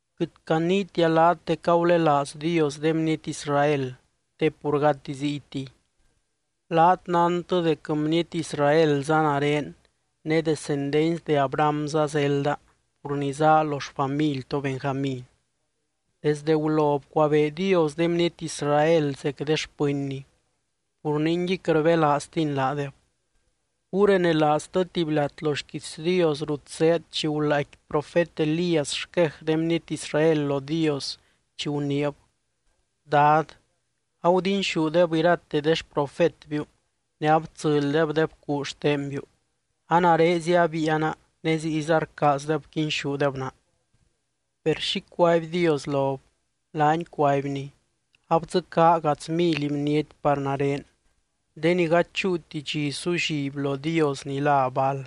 Quɨt caniitia laat dec agulelaaz Dios de bniety Israel, te pur gati ziytiy. Laat nántɨ dec bniety Israelza nare ne descendency de Abrahamza zelda pur ni zaa lo xfamily to Benjamín. Desdɨ gulo bcuabee Dios de bniety Israel zec de xpɨnny, pur ningui quɨt rbelaaztiny laadeb. Gurenelaaztɨ tuby lat lo xquiits Dios rut zéed chi gulaaicqui profet Elías xquej de bniety Israel lo Dios chi guniib: “Dad, agudinxúdeb irate de xprofetbiu ne abtsɨlydeb de bcuu xtenbiu. A narezia abiiana ne ziyza rcaazdeb quinxúdeb naa.” Per, ¿xi cuaby Dios lob? Laany cuaibny: “Abdzɨcaa gadz mily bniety par nare, de ni gady chúuti dxi sulliby lo dios ni lá Baal.”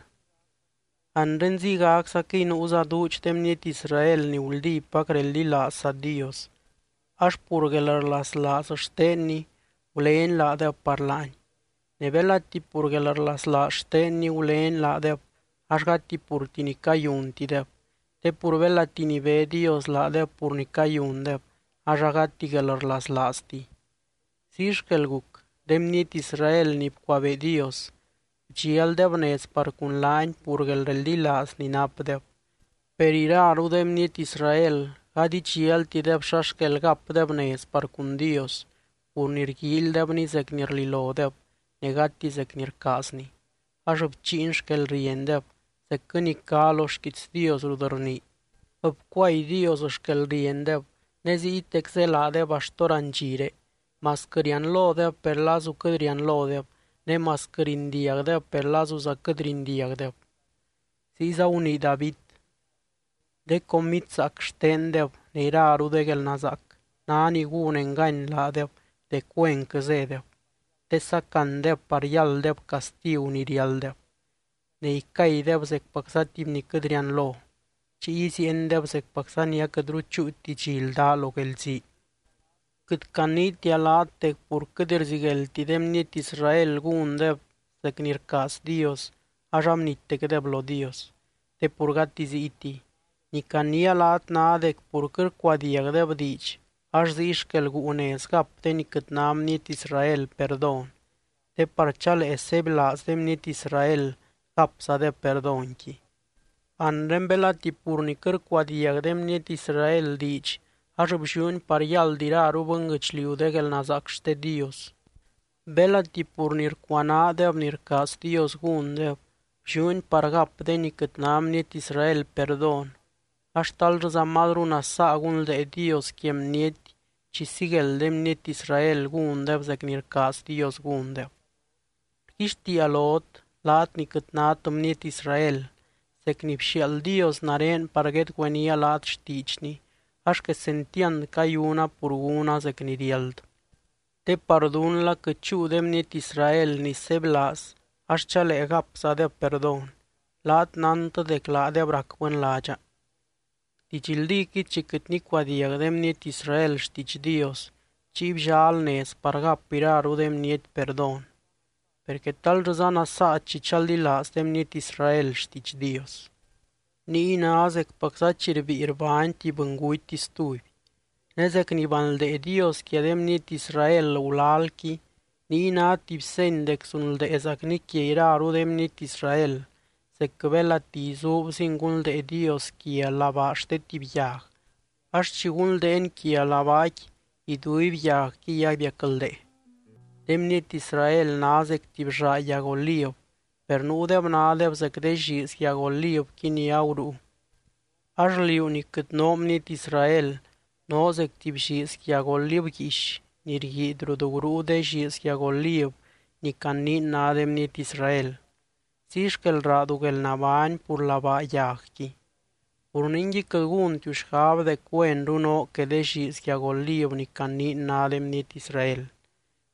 Anre ziygaczaquɨy nuuza duudx de bniety Israel ni guldípac reldilaazza Dios, ax pur guelrlaslaaz xtenny gulény laadeb par laany. Ne belati pur guelrlaslaaz xtenny gulény laadeb ax gati purti ni cayuntideb, te pur belati nibé Dios laadeb pur ni cayundeb ax agati guelrlaslaaztiy. Ziy xquel guc. De bniety Israel ni bcuabee Dios, bdxialdeb nez par cun laany pur guelreldilaaz ni napdeb. Per iraru de bniety Israel gady idxialtideb xa xquel gapdeb nez par cun Dios, pur ni rguíilydebny zec ni rlilodeb ne gati zec ni rcaazny, ax bchiiny xquelriendeb, zecquɨ ni cá lo xquiits Dios rut rnii: “Bcuay Dios xquelriendeb ne ziytec zélaadeb axt hórandxire, masquɨ rianlodeb per lazu quɨt rianlodeb, ne masquɨ rindiagdeb per lazuza quɨt rindiagdeb.” Ziyza gunii David: De comid zaac xtendeb ne iraru de guelnazaac ná ni gún engany laadeb dec güenquɨ zédeb, te sacandeb par yálddeb castigu ni riálddeb. Ne icaydeb zecpacza tuby ni quɨt rianlo, chiy iziiendeb zecpacza ni aquɨtru chúuti dxi ldá lo guelzii. Quɨt caniitia laat dec pur quɨt rzigueldti de bniety Israel gúndeb zec ni rcaaz Dios ax abnittecdeb lo Dios, te pur gati ziytiy. Ni caniia laat ná dec pur quɨt rcuadiagdeb diidx ax ziy xquel guu nez gap de ni quɨt ná bniety Israel perdón, te par chalee sebylaaz de bniety Israel gapzadeb perdónqui. Anre belati pur ni quɨt rcuadiag de bniety Israel diidx ax blliúni par yáld iraru bɨnguɨchliu de guelnazaac xte Dios, belati pur ni rcuanaadeb ni rcaaz Dios gúndeb, blliúni par gap de ni quɨt ná bniety Israel perdón ax, ¡tal llɨza mazru nasaa gunldee Dios quia bniety chi sigueld de bniety Israel gúndeb zec ni rcaaz Dios gúndeb! Rguixtiia lot laat ni quɨt nát bniety Israel, zec ni bxiaald Dios nare par guedgüeníaa laat xtiidxny ax quesentiand cayuna pur gúna zec ni riáld. Te par dún la quɨt chúu de bniety Israel ni sebylaaz ax chalee gapzadeb perdón, laat nántɨ dec laadeb rac bɨnládxa. Didxldíquɨy chi quɨt nicuadiag de bniety Israel xtiidx Dios chiy bllal nez par gap iraru de bniety perdón. Per, ¿quetal llɨza nasaa chi chaldilaaz de bniety Israel xtiidx Dios? Niy ná zecpacza chi rbíi rbány tuby bɨnguty stuby. Ne zec ni banldee Dios quia de bniety Israel gulalqui niy ná tuby seny dec zunldeezacny quia iraru de bniety Israel, zecquɨ belati izuubzin gunldee Dios quia labaa xte tuby yag ax chi gunldeeny quia labaaqui iduiby yagquiy abiacldee. De bniety Israel ná zec tuby llaa yag oliv, per nuudeb nádeb zec de lliiz yag olivqui ni agurúu. Ax liú ni quɨt noo bniety Israel noo zec tuby lliiz yag oliv guiix ni rguiidy rut gurúu de lliiz yag oliv ni caniin ná de bniety Israel, ziy xquel raadu guelnabány pur labaa yagqui. Pur ningui, quɨt gúntiu xgab dec güenru noo que de lliiz yag oliv ni caniin ná de bniety Israel.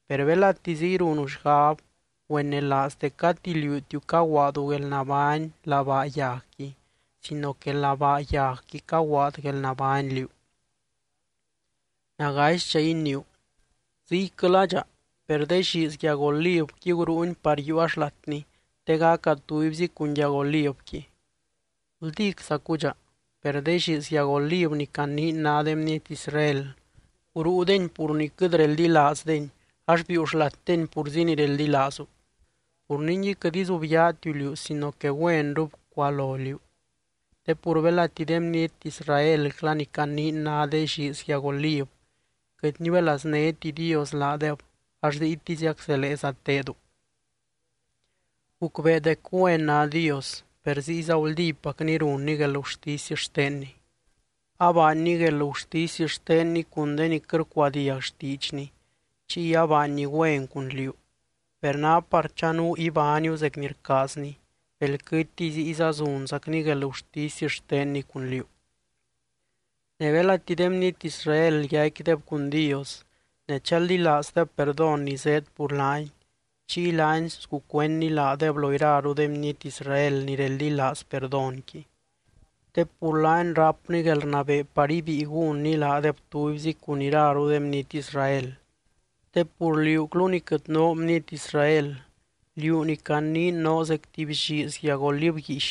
Per belati ziy runu xgab, güenelaaz dec gati liútiu caguaadu guelnabány labaa yagqui sino que labaa yagqui caguaad guelnabány liú. Nagaisdxa iniiu: “Ziyquɨladxa, per de lliiz yag olivqui gurúuni par yiiua xlatni te gaca tubyzi cun yag olivqui.” Guldíczacudxa, per de lliiz yag oliv ni caniin ná de bniety Israel, gurúudeni pur ni quɨt reldilaazdeni ax biiu xlatdeni purzi ni reldilaazu. Pur ningui quɨt izubyaatiu liú sino que güenru bcualo liú. Te pur belati de bniety Israelcla ni caniin ná de lliiz yag oliv, quɨt niuelaznéti Dios laadeb ax ziytiziac zeleeza tedu. Gucbee dec güen ná Dios, per ziyza guldípacny runny guelgurtisy xtenny. Abaanny guelgurtisy xtenny cun de ni quɨt rcuadiag xtiidxny, chiy abaanny güen cun liú. Per ná par chanuu ibániu zec ni rcaazny, belquɨtiy ziyza zunzacny guelgurtisy xtenny cun liú. Ne belati de bniety Israel yaicquideb cun Dios ne chaldilaazdeb perdón ni zéed pur laany, chiy laany sgucuendny laadeb lo iraru de bniety Israel ni reldilaaz perdónqui. Te pur laany rápny guelrnabee par ibíi gúnny laadeb tubyzi cun iraru de bniety Israel. Te pur liúclu ni quɨt noo bniety Israel, liú ni caniin noo zec tuby lliiz yag oliv guiix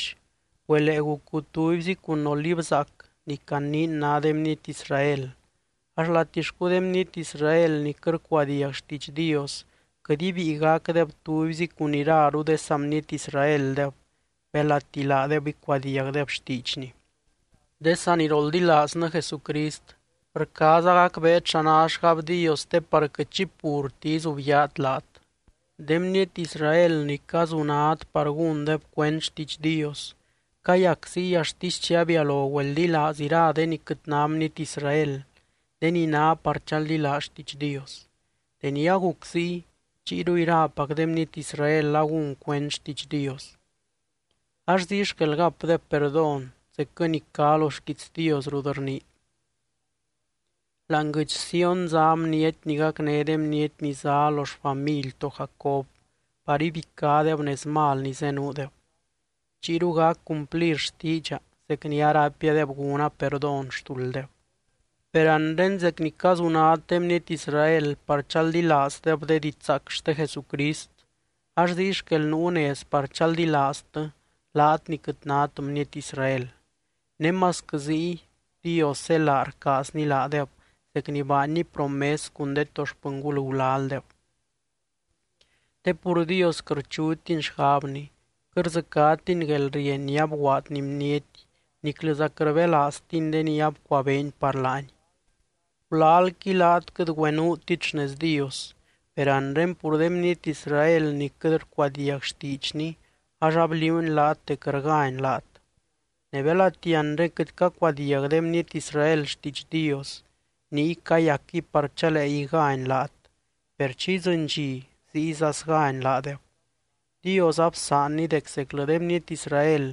güelee gucu tubyzi cun oliv zaac ni caniin ná de bniety Israel ax, ¡latixcu de bniety Israel ni quɨt rcuadiag xtiidx Dios quɨt ibíi gacdeb tubyzi cun iraru de saa bniety Israeldeb, belati laadeb icuadiagdeb xtiidxny! De saniroldilaaznɨ Jesucrist, rcaaza gacbeet xa ná xgab Dios te par quɨt xi purti izubyaat laat. De bniety Israel ni cazunad par gúndeb cuend xtiidx Dios, cayac ziy axtisy chi abialo güeldilaaz ira de ni quɨt ná bniety Israel, de ni ná par chaldilaaz xtiidx Dios. Deni aguc ziy, chiyru irapac de bniety Israel agún cuend xtiidx Dios. Ax ziy xquel gapdeb perdón zecquɨ ni cá lo xquiits Dios rut rnii: Láani guɨdx Sión zá bniety ni gacné de bniety ni zá lo xfamily to Jacob par ibicádeb nez mal ni zenuudeb. Chiyru gac cumplir xtiidxa zec ni araipiadeb gúna perdón xtulddeb. Per anre zec ni cazunad de bniety Israel par chaldilaazdeb de didxzaac xte Jesucrist, ax ziy xquel nuu nez par chaldilaaztɨ laat ni quɨt nát bniety Israel. Ne masquɨ ziy Dios zélaa rcaazny laadeb zec ni baanny promes cun de to xpɨngul gulaldeb. Te pur Dios quɨt rchutiny xgabny, quɨt rdzɨcátiny guelrieny ni abguaadny bniety niclɨza quɨt rbelaaztiny de ni abcuabeeny par laany. Gulalqui laat quɨt güenuutit xnez Dios, per anre pur de bniety Israel ni quɨt rcuadiag xtiidxny ax abliuuny laat dec rgány laat. Ne belati anre quɨt cacuadiag de bniety Israel xtiidx Dios, niy cayacquɨy par chalee igány laat, per chi idzɨny dxi ziyza sgány laadeb. Dios absaanny dec zeclɨ de bniety Israel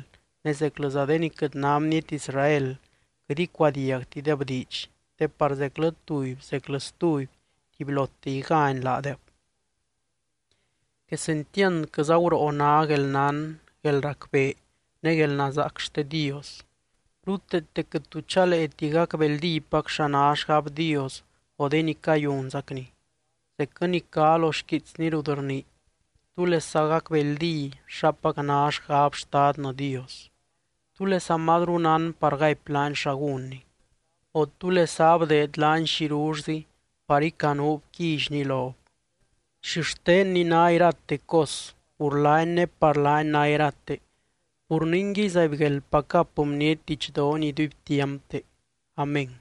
ne zeclɨza de ni quɨt ná bniety Israel quɨt icuadiagtideb diidx, te par zeclɨ tuby zeclɨ stuby tubylote igány laadeb. ¡Quesentiandquɨza guroo ná guelnán, guelracbee ne guelnazaac xte Dios! Ruteete quɨt tu chaleeti gacbeldípac xa ná xgab Dios o de ni cayunzacny, zecquɨ ni cá lo xquiitsny rut rnii: “¿Túlesa gacbeldí xapac ná xgab Xtadnɨ Dios? ¿Túlesa mazru nán par gaipy laany xa gúnny? O, ¿túlesa abdeed laany xirullzi par icanuub quillyny lob?” Xixtenny ná irate cos, pur laany ne par laany ná irate. Pur ningui zaibgueldpac gap bniety didxdoony iduibtiampte. Amén.